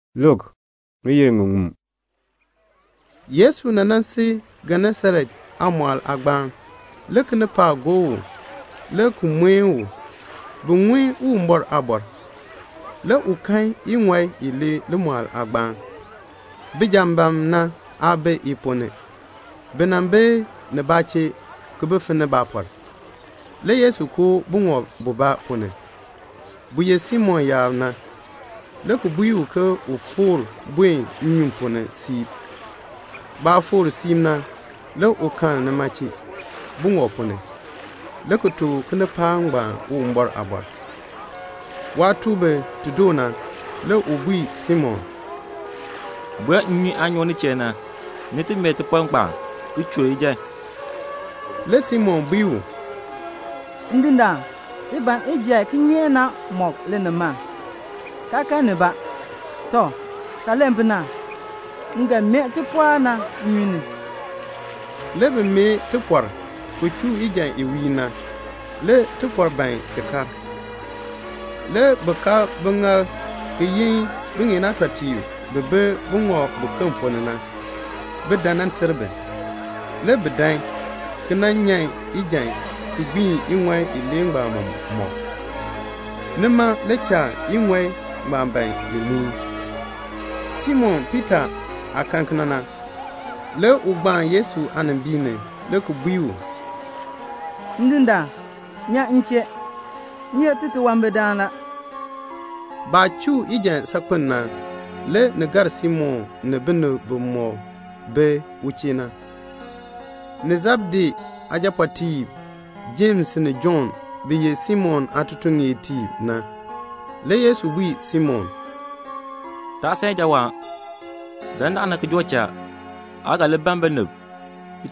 Le Yesu nan sil Genesaret aamɔɔl aagbaan. Le kinipaak gob u, le ki mueni u, bin ŋun Uwumbɔr aaliin. Le u kan iŋɔi ilee limɔɔl aagbaan. Bijambaam na aa bi i ponn ni. Bi bi nibaa chee, ki bi finni baapɔr. Le Yesu koo buŋɔb bubaa ponn ni, bu ye Simon yaab na, le ki bui u ke un foor nnyun ponn ni siib. Baah foor siib na, le u kal nima chee buŋɔb ponn ni, le ki tuk kinipaak ngbaan Uwumbɔr aaliin. Waah tuk bi ti doo na, le u bui Simon, "Buen nnyun aah nyoo nin chee na, ni ti mee tipɔr ngbaan ki chuu ijan." Le Simon bui u, "Ndindaan, ti ban ijan kinyeek na mɔk linimaln, kaa kan nibaa. Tɔ, saah len pu na, m ga mee tipɔr na nnyun ni." Le bi mee tipɔr, ki chuu ijan i wiir na. Le tipɔr ban ti kar. Le bi kab biŋaal ki yin biŋeen aatɔtiib bi bi buŋɔb buken ponn ni na, bin dan nan ter bi. Le bi dan, ki nan nyan ijan ki gbiin iŋɔi ilee ngbaan mɔk. Nima le cha iŋɔi ngbaan ban i muin. Simon Piita aah kan kena na, le u gbaan Yesu aanimbiin ni, le ki bui u, "Ndindaan, nyan m chee. M ye titunwambirdaan la." Baah chuu ijan saakpen pu na, le ni gar Simon ni binib bimɔk bi u chee na, ni Sebedee aajapɔɔtiib Jems ni Jɔnn bi ye Simon aatutuŋeertiib na. Le Yesu bui Simon, "Taa san ijawaan. Dandana ki joo cha, aa ga li ban binib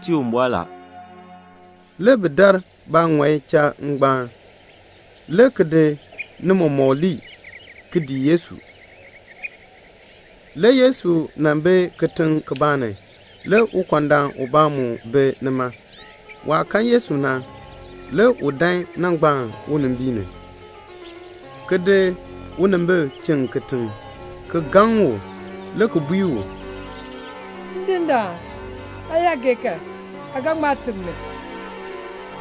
tii Uwumbɔr." Le bi dar baaŋɔi cha ngbaan, le ki di ni mɔmɔk ki di lii, le ki dii Yesu. Le Yesu nan bi kitiŋ kibaa ni. Le ukɔndaan ubaa mu bi nima. Waah kan Yesu na, le u dan nan gbaan unimbiin ni, ki di unimbil chiŋ kitiŋ, le ki gaŋ u, le ki bui u, "Ndindaan, aa yaa gee kan, aa ga ŋma teb mi."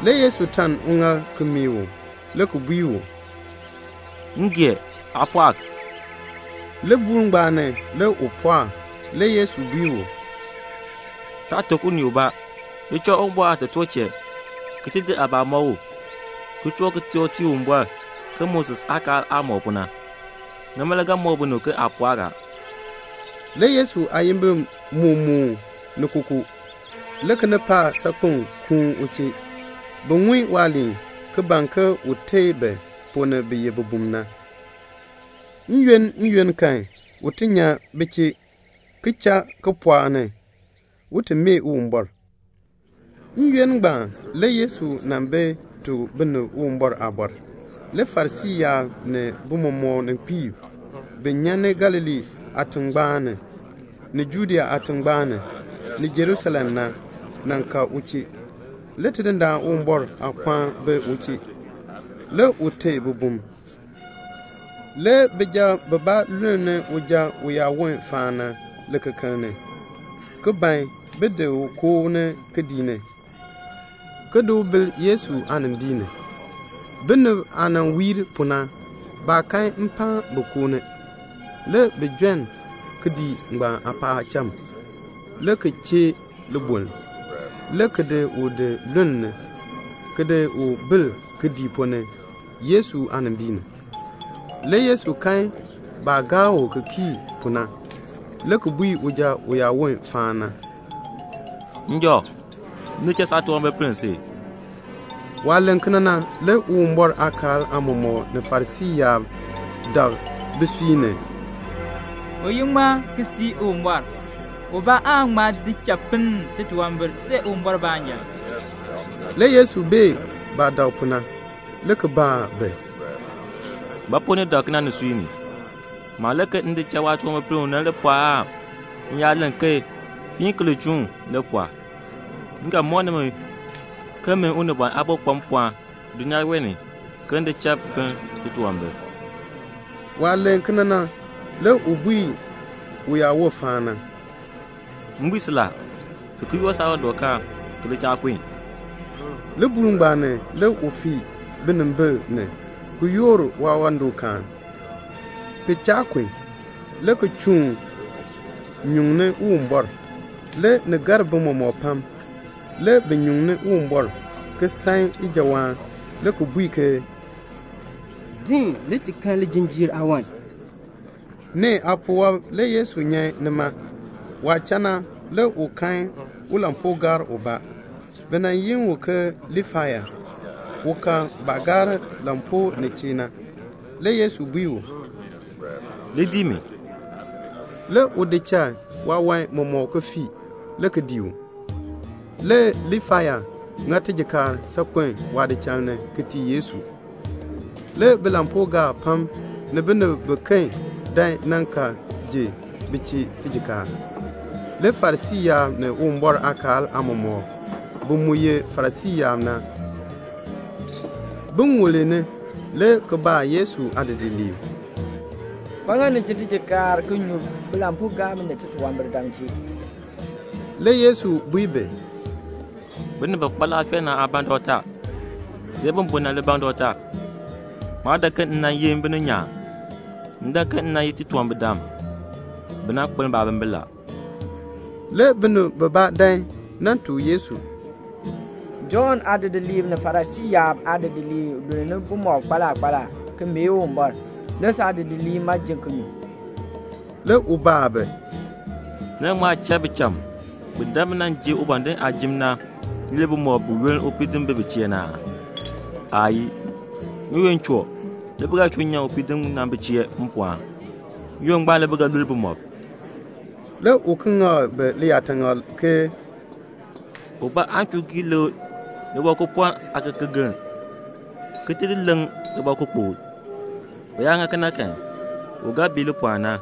Le Yesu taln uŋaal ki meeh u, le ki bui u, "M gee. Aa pɔɔk." Libuul ngbaan ni, le u pɔɔk. Le Yesu bui u, "Taa tuk unii ubaa. Li cha Uwumbɔr aatotoor chee, ki di aabaa ki di mɔk u, ki toor kitork ki tii Uwumbɔr ke Moses aakaal aah mɔk pu na. Nima le ga mɔk binib ke aa pɔɔk a." Le Yesu aayimbil moo moon ni kookoo. Le kinipaak saakpeŋ kuun u chee, bin ti ŋun waaliin, ki ban ke un teei bi ponn ni bi ye bibum na. N-yoonn, n-yoonn kan, le u nyan bi chee, ki cha kipɔɔk ni, un ti mee Uwumbɔr. N-yoonn ngbaan le Yesu nan bi tuk binib Uwumbɔr aaliin. Le Farisii yaab ni bimɔmɔkninkpiib bi nyan ni Galilee aatingbaan ni, ni Judea aatingbaan ni, ni Jerusalem na, nan ka u chee. Le Tidindaan Uwumbɔr aapɔɔn bi u chee, le u teei bibum. Le bijab bibaa lulni uja uyaawon faan na likekeln ni, ki ban bin di u koo ni kidiik ni, ki ti di bil Yesu aanimbiin ni. Binib aah wiir pu na, baa kan mpaan bin koo ni. Le bi jon kidiik aapaacham, le ki chee liboln, le ki di u di lulni, le ki di bil kidiik ponn ni Yesu aanimbiin ni. Le Yesu kan baah gaa u ki kii pu na, le ki bui uja uyaawon faan na, "Njɔ, m di cha saatunwambir ki pinn si." Waah len kena na le Uwumbɔr aakaal aamɔmɔkb ni Farisii yaab dak bisui ni, "U ye ŋmaa ki sii Uwumbɔr? Ubaa aan ŋma di cha pinn titunwambir see Uwumbɔr baanja." Le Yesu bee baah dak pu na, le ki baa bi, "Ba pu ni dak kena nisui ni? Maah len ke m di cha waatunwambir ki pinn u na le pɔɔ aan m yaa len ke 'Fiin ki li chuun' li pɔɔ? M ga mɔk nimi ke min Unibɔn Aabo kpa mpɔɔn dulnyaa wee ni ke m di cha pinn titunwambir." Waah len kena na, le u bui uyaawon faan na, "M bui si la, fiin ki yoor saawandɔkaan ki li cha kun." Libuul ngbaan ni le u fii binimbil ni, le ki yoor waawandɔkaan, ki cha kun, le ki chuun nyuŋni Uwumbɔr. Le ni gar bi mɔmɔk pam. Le bi nyuŋ Uwumbɔr, ki san ijawaan, le ki bui ke, "Din, le ti kan lijinjiir aawan." Nee aapuwɔb le Yesu nyan nima. Waah cha na le u kan ulampuugaar ubaa, le bi yi u ke Liifai. U ka baah gaar lampuu nin chee na. Le Yesu bui u, "Li dii mi." Le u di cha waawan mɔmɔk le ki fii, le ki dii u. Le Liifai ŋa tijikaar saakpen waadichal ni ki tii Yesu. Le bilampuugaab pam ni binib biken dan nan ka ji bi chee tijikaar. Le Farisii yaab ni Uwumbɔr aakaal aamɔmɔkb bi mu ye Farisii yaab na, bi ŋulni le ki baa Yesu aadidiliib, "Ba ŋa ni ji tijikaar ki nyu nnyun bilampuugaab ni titunwambirdam chee?" Le Yesu bui bi, "Binib bi kpa laafee na aa ban dɔkta, see bi bun na le ban dɔkta. Maa dan ke m nan yi bininyaan. M dan ke m nan yi titunwambirdam, bi nan kpeln baabimbin." Le binib bibaa dan ki nan tuk Yesu, "Jɔnn aadidiliib ni Farisii yaab aadidiliib lul bumɔb kpaala kpaala, ki mee Uwumbɔr. Saadidiliib ma ji ki nyu." Le u baa bi, "Ni ga ŋma cha bicham bi dan bi nan ji ubɔndinn aajim na lul bumɔb buyoonn upiidinn bi bi chee na aa? Aayii. N-yoonn choo la, le bi ga chuu nyan upiidinn na bi chee mpɔɔn. N-yoonn ngbaan le bi ga lul bumɔb." Le u ki ŋak bi liyaataŋakl ke, "Ubaa aan chuu gii lekr libɔkupɔln aakekegeln ki ti di leŋ libɔkukpokl. U yaa ŋa kena kan, u ga bii lipɔln na.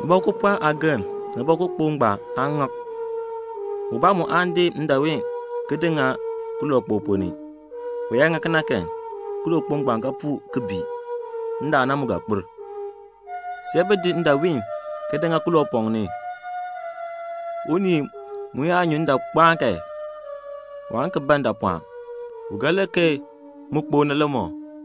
Libɔkupɔln aageln ni libɔkukpokl ngbaan, naan ŋak. Ubaa mu aan di ndaawiin ki di ŋa kilookpok ponn ni. U yaa ŋa kena kan kilookpok ngbaan ga puu ki bii. Ndaan na mu ga kpir. See bi di ndaawiin ki di ŋa kiloopɔŋ ni. Unii mu yaa nyu ndaankpaan kan, waan ki ban ndaapɔɔn. U ga len ke mu kpok na le mɔ."